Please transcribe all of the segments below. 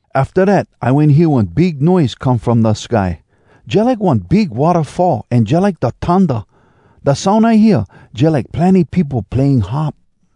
Afta dat I wen hear one big noise come from da sky, jalike one big wattafall, an jalike da thunda. Da soun I hear, jalike plenny peopo playing harp.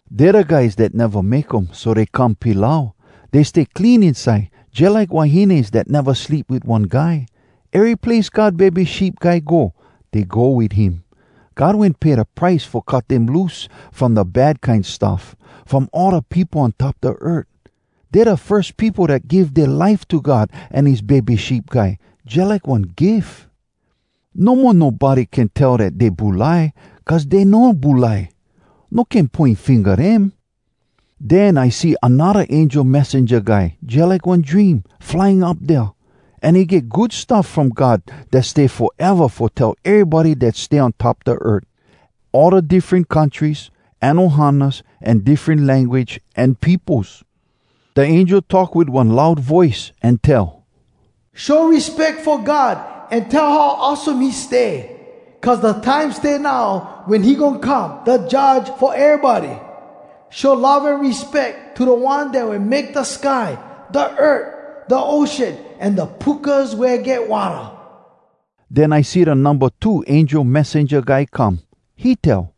Dey da guys dat neva make um so dey come pilau. Dey stay clean inside, jalike wahines dat neva sleep wit one guy. Ery place God Bebe Sheep Guy go, dey go wit him. God wen pay da price fo cut dem loose from da bad kine stuff, from all da peopo on top da earth. Dey da firs peopo dat give dea life to God an his Bebe Sheep Guy, jalike one gif. No mo nobody can tell dat dey bulai, cuz dey no bulai. No can poin finga dem. Den I see anodda angel messenja guy, jalike one dream, flying up dea. An he get Good Stuff From God dat stay foeva fo tell erybody dat stay on top da earth: all da diffren countries, an ohanas, an diffren language, an peopos. Da angel talk wit one loud voice, an tell, “Show respeck fo God an tell how awesome he stay! Cuz da time stay now wen he goin come da Judge fo erybody. Show love an respeck to da One dat wen make da sky, da earth, da ocean, an da pukas wea get watta.” Den I see da numba two angel messenja guy come. He tell,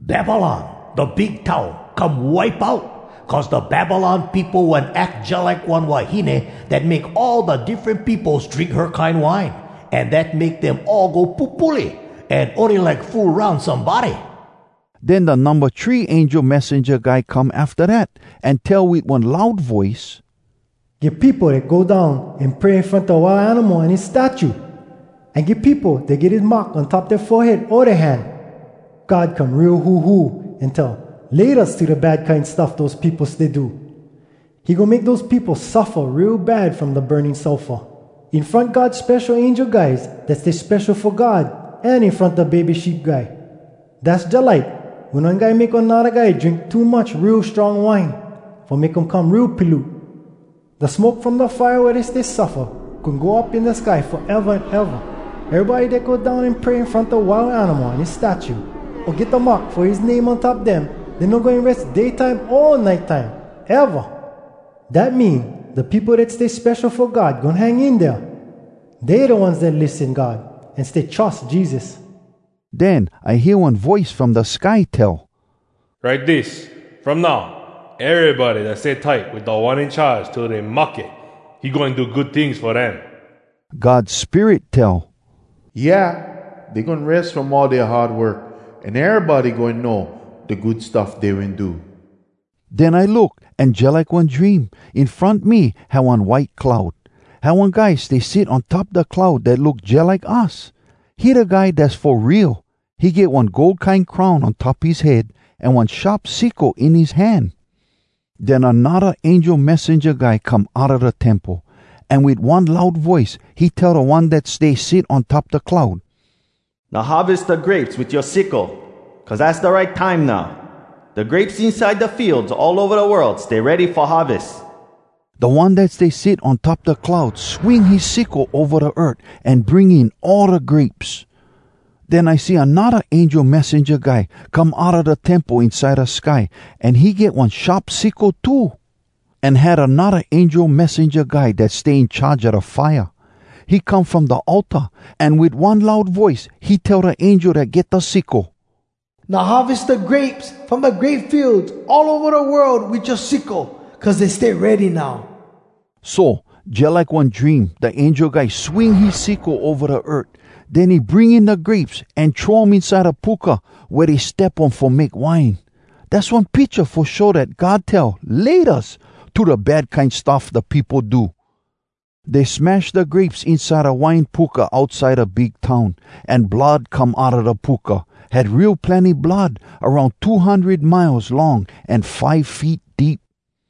“Babylon, da Big Town, come wipe out! Cuz da Babylon peopo wen ack jalike one wahine dat make all da diffren peopos drink her kine wine, an dat make dem all go pupule an ony like fool aroun somebody.” Den da numba three angel messenja guy come afta dat, an tell wit one loud voice, “Get peopo dat go down an pray in front da Wild Animal an his statue. An get peopo dat get his mark on top dea forehead o dea hand. God come real huhu an tell ‘Laytas’ to da bad kine stuff dose peopo stay do. He goin make dose peopo suffa real bad from da burning sulfur, in front God spesho angel guys dat stay spesho fo God an in front da Bebe Sheep Guy. Dass jalike wen one guy make anodda guy drink too much real strong wine, fo make um come real piloot. Da smoke from da fire wea dey stay suffa goin go up in da sky foeva an eva. Erybody dat go down an pray in front da Wild Animal an his statue, o get da mark fo his name on top dem, dey no goin res day time o nite time, eva! “Dat mean, da peopo dat stay spesho fo God goin hang in dea. Dey da ones dat lissen God, an stay trus Jesus.” Den I hear one voice from da sky tell, “Write dis: From now, erybody dat stay tight wit Da One In Charge till dey mahke, he goin do good tings fo dem.” God Spirit tell, “Yeah! Dey goin res from all dea hard work, an erybody goin know da good stuff dey wen do.” Den I look, an jalike one dream, in front me had one white cloud. Had one guy stay sit on top da cloud dat look jalike us. He da Guy Dass fo Real. He get one gold kine crown on top his head, an one sharp sickle in his hand. Den anodda angel messenja guy come outa da temple, an wit one loud voice he tell da One dat stay sit on top da cloud, “Now harves da grapes wit yoa sickle, cuz az da right time now. Da grapes inside da fields all ova da world stay ready fo harves.” Da One dat stay sit on top da cloud swing his sickle ova da earth, an bring in all da grapes. Den I see anodda angel messenja guy come outa da temple inside da sky, an he get one sharp sickle too. An had anodda angel messenja guy dat stay in charge a da fire. He come from da altar, an wit one loud voice he tell da angel dat get da sickle, “Now harves da grapes from da grape fields all ova da world wit yoa sickle, cuz dey stay ready now.” So, jalike one dream, da angel guy swing his sickle ova da earth. Den he bring in da grapes, an throw um inside da puka wea dey step um fo make wine. Dass one picha fo show dat God tell “Laytas” to da bad kine stuff da peopo do. Dey smash da grapes inside da wine puka outside da big town, an blood come outa da puka. Had real plenny blood, aroun two hundred miles long an five feet deep.